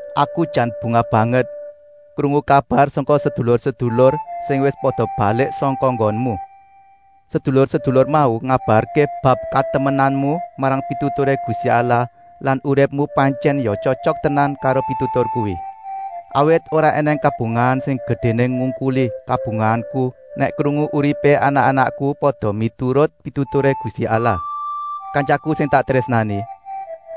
Aku jan bungah banget krungu kabar sangka sedulur-sedulur sing wis pada balik sangka nggonmu. Sedulur-sedulur mau ngabarké bab katemenanmu marang pituturé Gusti Allah lan uripmu pantyèn ya tyotyok tenan karo pitutur kuwi. Awit ora ènèng kabungahan sing gedéné ngungkuli kabungahanku nèk krungu uripé anak-anakku pada miturut pituturé Gusti Allah. Kantyaku sing tak trésnani,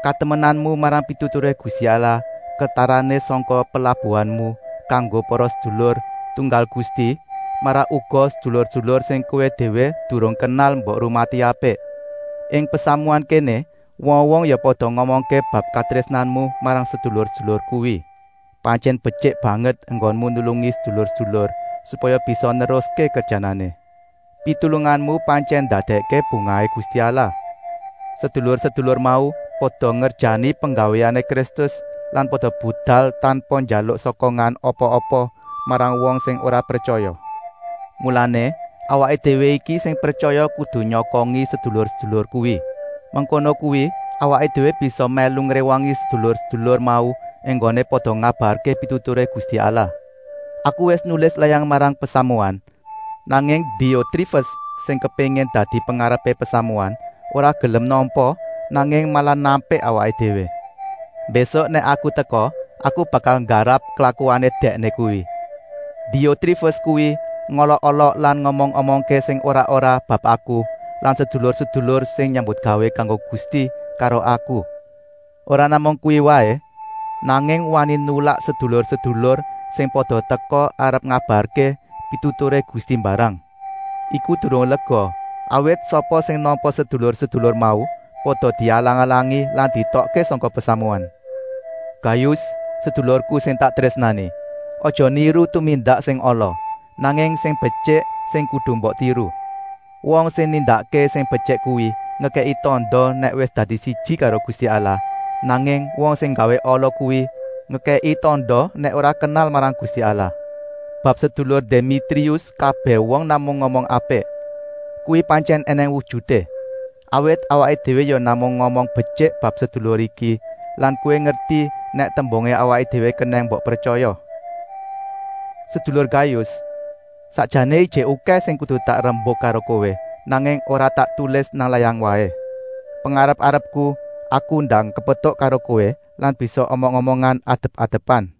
katemenanmu marang pituturé Gusti Allah ketarané sangka pelabuhanmu kanggo para sedulur tunggal Gusti, malah uga sedulur-sedulur sing kowé déwé durung kenal mbok rumati apik. Ing pasamuan kéné wong-wong ya pada ngomongké bab katrésnanmu marang sedulur-sedulur kuwi. Pantyèn betyik banget enggonmu nulungi sedulur-sedulur, supaya bisa neruské kerjanané. Pitulunganmu pantyèn ndadèkké bungahé Gusti Allah. Sedulur-sedulur mau pada ngerjani penggawéané Kristus lan pada budal tanpa njaluk sokongan apa-apa marang wong sing ora pretyaya. Mulané, awaké déwé iki sing pretyaya kudu nyokongi sedulur-sedulur kuwi. Mengkono kuwi awaké déwé bisa mèlu ngréwangi sedulur-sedulur mau enggoné pada ngabarké pituturé Gusti Allah. Aku wis nulis layang marang pasamuan, nanging Diotrifes, sing kepéngin dadi pengarepé pasamuan, ora gelem nampa, nanging malah nampik awaké déwé. Mbésuk nèk aku teka aku bakal nggarap klakuané dèkné kuwi. Diotrifes kuwi ngolok-olok lan ngomong-omongké sing ora-ora bab aku lan sedulur-sedulur sing nyambutgawé kanggo Gusti karo aku. Ora namung kuwi waé, nanging wani nulak sedulur-sedulur sing pada teka arep ngabarké pituturé Gusti mbarang. Iku durung lega, awit sapa sing nampa sedulur-sedulur mau pada dialang-alangi lan dietokké sangka pasamuan. Gayus, sedulurku sing tak trésnani, aja niru tumindak sing ala, nanging sing betyik sing kudu mbok tiru. Wong sing nindakké sing betyik kuwi ngekèki tanda nèk wis dadi siji karo Gusti Allah, nanging wong sing nggawé ala kuwi ngekèki tanda nèk ora kenal marang Gusti Allah. Bab sedulur Demitrius kabèh wong namung ngomong apik. Kuwi pantyèn ènèng wujuté, awit awaké déwé ya namung ngomong betyik bab sedulur iki lan kowé ngerti nèk tembungé awaké déwé kenèng mbok pretyaya. Sedulur Gayus, sakjané ijik okèh sing kudu tak rembuk karo kowé, nanging ora tak tulis nang layang waé. Pengarep-arepku aku ndang kepetuk karo kowé lan bisa omong-omongan adep-adepan.